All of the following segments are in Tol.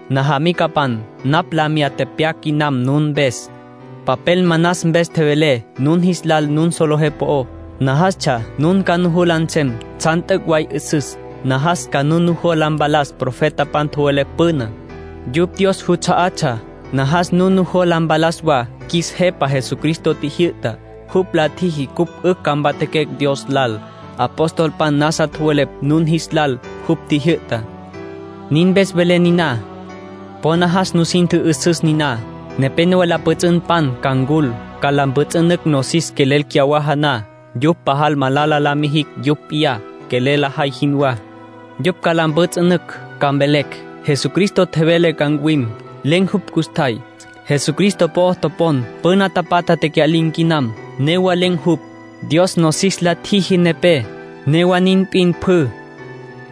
Najamicapan, napj la miyá tepyac quinam nun mpes. Papel manas mpes tjevelé nun jis lal nun solejé po'ó. Najastsja nun ca nujola nsem tsjan t'üc' way 'üsüs. Najas ca nun nujola mpalas profetapan tjowelepj püná, yupj Dios juts'a'atsja. Najas nun nujola mpalas wa qjuis Jepa Jesucristo tjijyü'tá. Jupj la tjiji cupj 'ücj ca mpatjaquecj Dios lal. Apostolpan nasa tjowelepj nun jis lal jupj tjijyü'tá. Nin mpes velé niná. Po najas nusin tjü'üsüs niná: nepénowa la pjüts'ünpan ca ncul, ca la mpjüts'ünücj nosis quelel cyawaja na. Yupj pajal malala la mijicj yupj p'iyá quelel lajay jinwá. Yupj ca la mpjüts'ünücj, ca mvelecj: “Jesucristo tjevele ca ncuwim. Len̈ jupj custjay. Jesucristo po'o topon püna tapatjá tecya'lin̈ quinam, newa len̈ jupj. Dios nosis la tjiji nepé, newa nin p'in pjü.”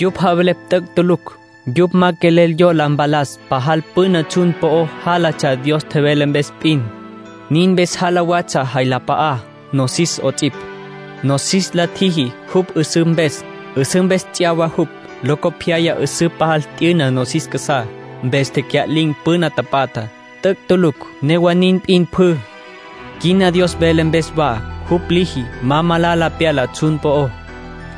Yupj javelepj t'üc' tulucj. Yupj ma quelel yola mpalas pajal püna tsjun po'o jálatsja Dios tjevele mpes p'in, nin mpes jala watsja jay la p'a'á, nosis 'ots'ipj. Nosis la tjiji jupj 'üsǘ mpes. 'Üsǘ mpes ts'yawa jupj. Locopyaya 'üsǘ pajal t'yüna nosis casá, mpes tecya'lin̈ püna tapatjá. (T'üc' tulucj newa nin p'in pjü.) Quina Dios vele mpes wa jupj liji ma malala pyala tsjun po'ó,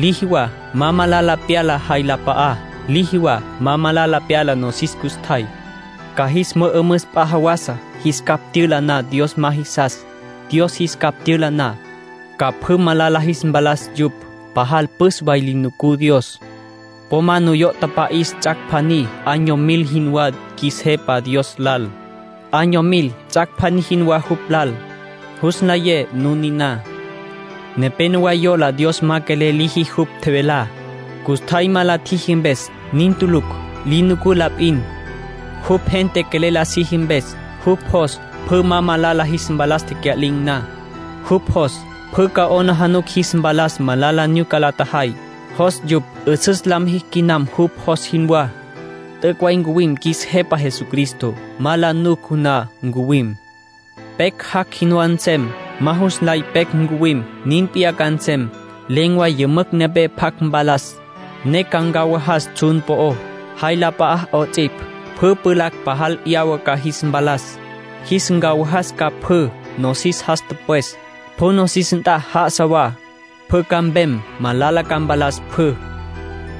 liji wa ma malala pyala jay la p'a'á, liji wa ma malala pyala nosis custjay. Ca jis mü'ümüs p'a jawasa, jis capj tyüla na Dios ma jisas. Dios jis capj tyüla na, ca pjü malala jis mpalas yupj. Pajal püs way li nucú Dios. Po ma nuyo' tapa'is ts'ac' pjaní año mil jinwá qjuis Jepa Dios lal. Año mil ts'ac' pjaní jinwá jupj lal. Jus nlayé nun niná. Nepénowa yola Dios ma quelel liji jupj tjevelá, custjay ma la tjiji mpes. Nin tulucj. Li nucú la p'in, jupj gente quelel la siji mpes. Jupj jos pjü ma malala jis mpalas tecya'lin̈ na. Jupj jos pjü ca 'aplijila jis mpalas malala nyuca la tjajay, jos yupj 'üsüs la mijicj quinam jupj jos jinwá. T'üc' way ncuwim qjuis Jepa Jesucristo. Ma la nuc na ncuwim. Pecj jac' jinwá nsem. Ma jus nlay pecj ncuwim. Nin p'iyá ca nsem. Len̈ way yümücj nepé pjac mpalas, ne ca ncawajas tsjun po'ó, jay la p'a'á 'ots'ipj. Pjü pjulacj pajal 'yawa ca jis mpalas, jis ncawajas ca pjü. Nosis jas tüpwes, pjü nosis nt'a já'asa wa, pjü ca mpem, malala ca mpalas pjü.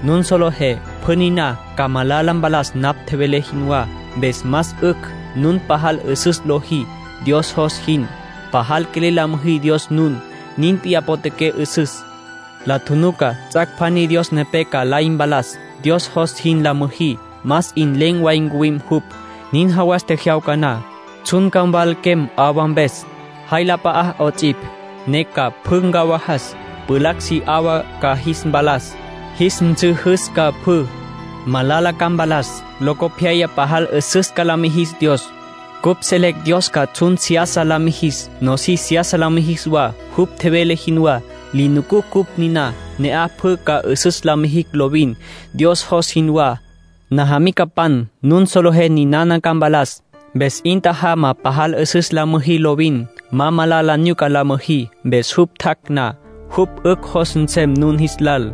Nun solejé pjü niná ca malala mpalas napj tjevelé jinwá, mpes más 'ücj nun pajal 'üsüs lojí, Dios jos jin. Pajal quelel la müjí Dios nun. Nin p'in potjaqué 'üsüs. La tjunuca ts'ac' pjaní Dios nepé ca lay mpalas. Dios jos jin la müjí, más 'in len̈ way ncuwim jupj. Nin jawas tjejyawca na, tsjun ca mwalaquem 'awa mpes, jay la p'a'á 'ots'ipj, ne ca pjü ncawajas. Pjulacj si 'awa ca jis mpalas, jis nsüjüs ca pjü. Malala ca mpalas; locopyaya pajal 'üsüs ca la mijis Dios. Cupj selecj Dios ca tsjun seyasa la mijis, nosis seyasa la mijis wa, jupj tjevele jinwá. Li nucucj cupj niná. Ne'aj pjü ca 'üsüs la mijicj lovin, Dios jos jinwá. Najamicapan, nun solejé ninana ca mpalas, mpes 'in tjajama pajal 'üsüs la müjí lovin. Ma malala nyuca la müjí. Mpes jupj tjac' na, jupj 'ücj jos nsem nun jis lal.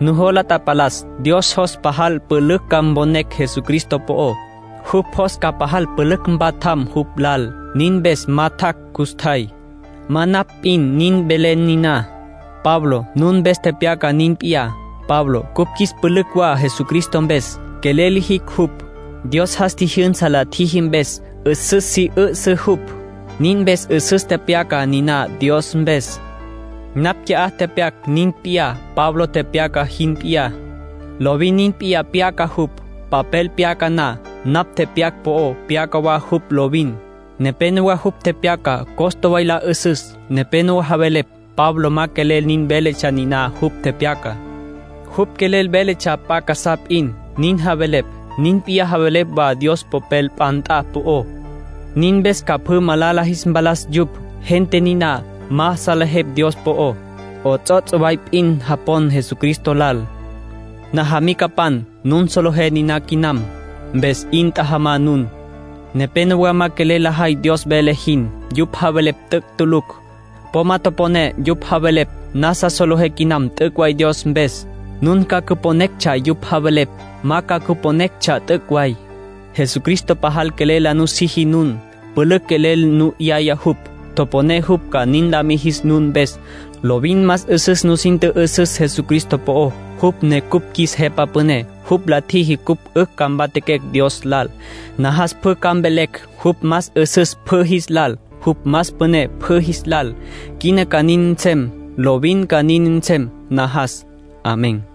Nujola tapalas Dios jos pajal pülücj ca mponecj Jesucristo po'ó. Jupj jos ca pajal pülücj mpatjam jupj lal. Nin mpes ma tjac' custjay. Ma napj p'in nin velé niná. Pablo nun mpes tepyaca nin p'iyá. Pablo cupj qjuis pülücj wa Jesucristo mpes. Quelel lijicj jupj. Dios jas tji'yüsa la tjiji mpes 'üsüs si 'üsǘ jupj. Nin mpes 'üsüs tepyaca niná Dios mpes. Napj qui'á tepyac nin p'iyá Pablo tepyaca jin p'iyá. Lovin nin p'iyá pyaca jupj, papel pyaca na. Napj tepyac po'ó pyaca wa jupj lovin. Nepénowa jupj tepyaca costa way la 'üsüs. Nepénowa javelepj Pablo ma quelel nin veletsja niná jupj tepyacá. Jupj quelel veletsja p'a casá p'in, nin javelepj. Nin p'iyá javelepj wa Dios Popel p'a nt'a po'ó. Nin mpes ca pjü malala jis mpalas yupj. Gente niná ma salejepj Dios po'ó. 'Ots'ots' way p'in japon Jesucristo lal. Najamicapan, nun solejé niná quinam. Mpes 'in tjajama nun. Nepénowa ma quelel lajay Dios vele jin. Yupj javelepj t'üc' tulucj. Po ma toponé yupj javelepj. Nasa solejé quinam t'üc' way Dios mpes. Nun ca cüponetsja yupj javelepj, ma ca cüponetsja t'üc' way. Jesucristo pajal quelel la nusiji nun. Pülücj quelel nu 'yaya jupj. Toponé jupj ca nin la mijis nun mpes. Lovin más 'üsüs nusin tjü'üsüs Jesucristo po'ó, jupj ne cupj qjuis Jepa Püné. Jupj la tjiji cupj 'ücj ca mpatjaquecj Dios lal. Najas pjü ca mvelecj jupj más 'üsüs pjü jis lal, jupj más püné pjü jis lal. Quina ca nin nsem. Lovin ca nin nsem, najas. Amén.